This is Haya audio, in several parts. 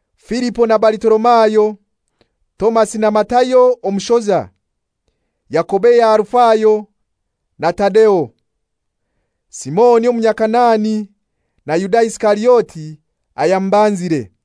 Filipo na Balitolomayo; Tomasi na Matayo omushoza; Yakobo eya Alufayo, na Tadeo; Simoni Omunyakanaani, na Yuda Isikariote, ayamubanzire.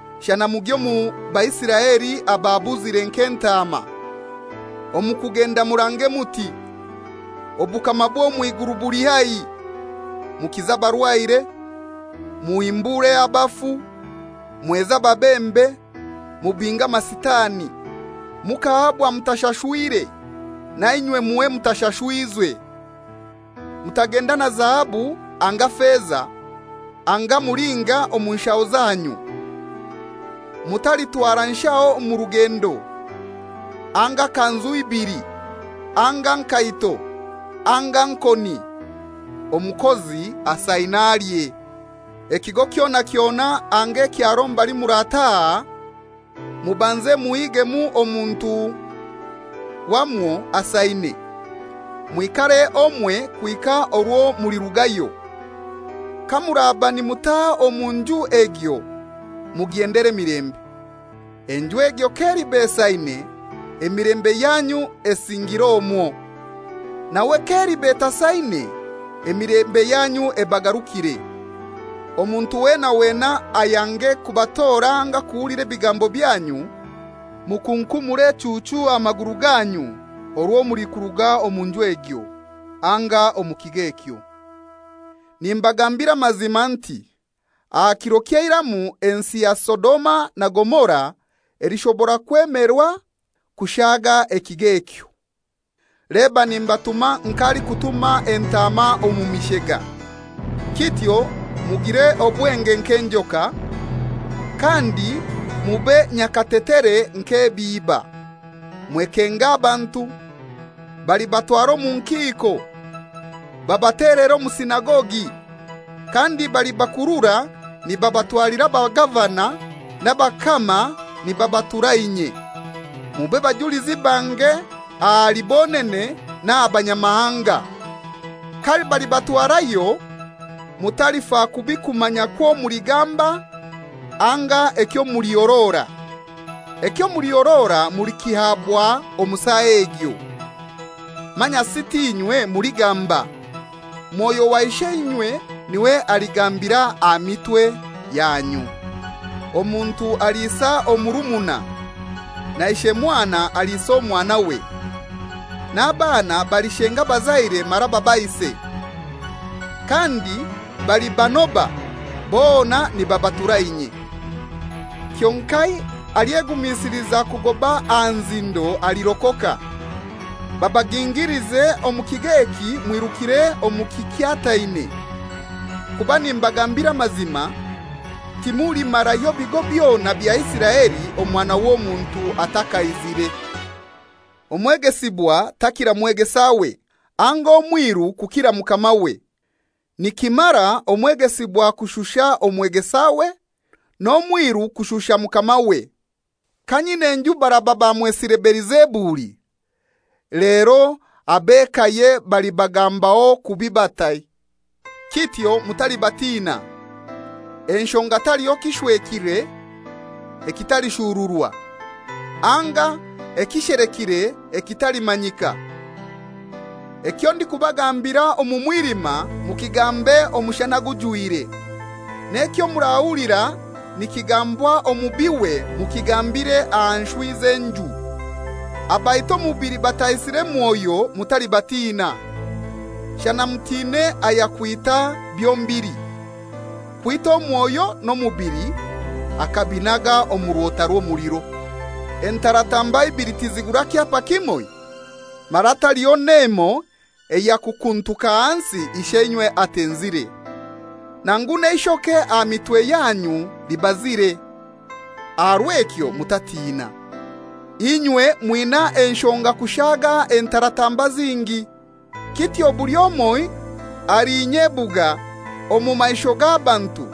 Shana mugye omu Baisiraeli ababuzire nk'entaama. Omu kugenda murange muti, ‹Obukama bw'omw'iguru buli haihi.› Mukize abarwaire, muhimbure abafu, mweze ababembe, mubinge amasitani. Mukahabwa mutashashwire, na inywe muhe mutashashwize. Mutagenda na zahabu, anga feza, anga mulinga mu nshaho zanyu. Mutalitwara nshaho mu rugendo, anga kanzu ibili, anga nkaito, anga nkoni. Omukozi asaine alye. Ekigo kyona kyona anga ekyaro mbali murataha, mubanze muhigemu omuntu wamwo asaine, mwikare omwe kuhika orwo mulirugayo. Kamuraba nimutaha omu nju egyo mugyendere emilembe. Enju egyo k'eliba esaine, emilembe yanyu esingire omwo. Nawe k'eliba etasaine, emilembe yanyu ebagarukire. Omuntu wena wena ayange kubatora anga kuhulira ebigambo byanyu, mukunkumure echuuchu aha maguru ganyu orwo mulikuruga omu nju egyo anga omu kigo ekyo. Nimbagambira amazima nti aha kiro ky'eiramu ensi ya Sodoma na Gomora elishobora kwemerwa kushaga ekigo ekyo.» «Leba nimbatuma nk'alikutuma entaama omu mishega. Kityo mugire obwenge nk'enjoka, kandi mube nyakatetere nk'ebiiba. Mwekenge abantu. Balibatwara omu nkiiko, babatelere omu sinagogi, kandi balibakurura nibabatwalira abagavana n'abakama nibabatura inye, mube bajulizi bange ahali bonene n'aha banyamahanga. Kabalibatwarayo mutalifa kubi kumanya kwo muligamba anga ekyo mulihorora. Ekyo mulihorora mulikihaabwa omu saa egyo. Manyasi t'inywe muligamba; Mwoyo wa Isheinywe niwe aligambira aha mitwe yanyu. Omuntu aliisa omurumuna, na ishe mwana aliisa omwanawe, n'abaana balishenga abazaire mara babaise. Kandi balibanoba bona nibabatura inye. Kyonkai alyegumisiliza kugoba aha nzindo alirokoka. Babagingilize omu kigo eki mwirukire omu kikyataine; kuba nimbagambira amazima, timulimarayo bigo byona bya Isiraeli Omwana w'Omuntu atakaizire.» «Omwegesibwa takira mwegesawe, anga omwiru kukira mukamawe. Nikimara omwegesibwa kushusha omwegesawe, n'omwiru kushusha mukamawe. Ka nyin'enju baraba bamwesire Belizebuli, lero ab'ekaye balibagambaho kubi batai?» «Kityo mutalibatina, enshonga taliho kishwekire ekitalishururwa, anga ekishelekire ekitalimanyika. Ekyo ndikubagambira omu mwilima, mukigambe omushana gujwire. N'ekyo murahulira nikigambwa omu bihwe mukigambire aha nshwi z'enju. Abaita omubili bataisire mwoyo mutalibatina. Shana mutine ayakwita byombilili: Kwita omwoyo n'omubili akabinaga omu rwota rw'omuliro. Entaratamba ibili tizigura kyapa kimoi? Mara taliho n'emoi eyakukuntuka hansi Isheinywe atenzire. Nangu n'eishoke aha mitwe yanyu libazire. Aha rw'ekyo mutatina; inywe mwina enshonga kushaga entaratamba zingi. Kityo buli omoi alinyebuga omu maisho g'abantu,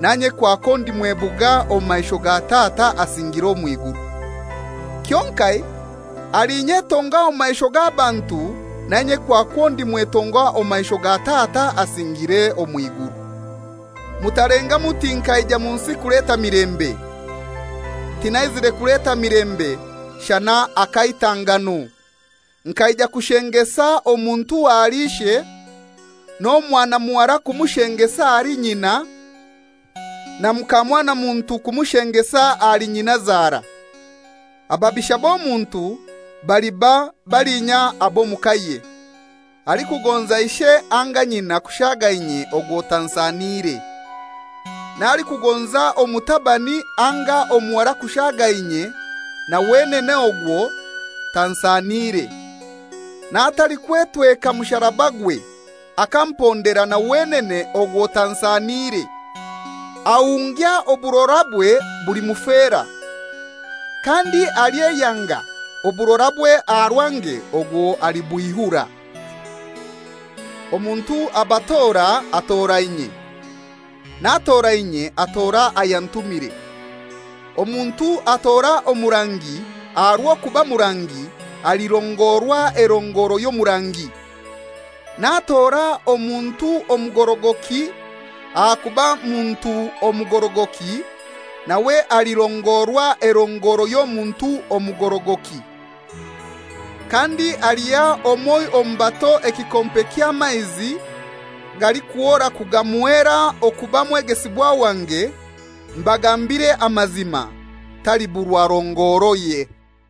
nanye kwakwo ndimwebuga omu maisho ga Tata asingiire omw'iguru. Kyonkai alinyetonga omu maisho g'abantu, nanye kwakwo ndimwetonga omu maisho ga Tata asingiire omw'iguru.» «Mutalenga muti nkaija omu nsi kuleta milembe. Tinaizire kuleta milembe, shana akaitangano. Nkaija kushengesa omuntu ahali ishe, n'omwana muhara kumushengesa ahali nyina, na mukamwanamuntu kumushengesa ahali nyinazara. Ababisha b'omuntu baliba balinya ab'omu kaye. Alikugonza ishe anga nyina kushaga inye ogwo tansaniire. N'alikugonza omutabani anga omuhara kushaga inye na wenene ogwo tansaniire. N'atalikwetweka musarabagwe akampondera na wenene ogwo tansaniire. Ahungya oburorabwe bulimufera, kandi alyeyanga oburorabwe aha rwange ogwo alibwihura.» «Omuntu abatora atora inye, n'atora inye atora ayantumire. Omuntu atora omurangi aha rw'okuba murangi alirongorwa erongoro ey'omurangi, n'atora omuntu omugorogoki ahakuba muntu omugorogoki, nawe alirongorwa erongoro y'omuntu omugorogoki. Kandi aliha omoi omu bato ekikompe ky'amaizi galikuhora kagamuheera okuba mwegesibwa wange, mbagambire amazima, taliburwa rongoroye.»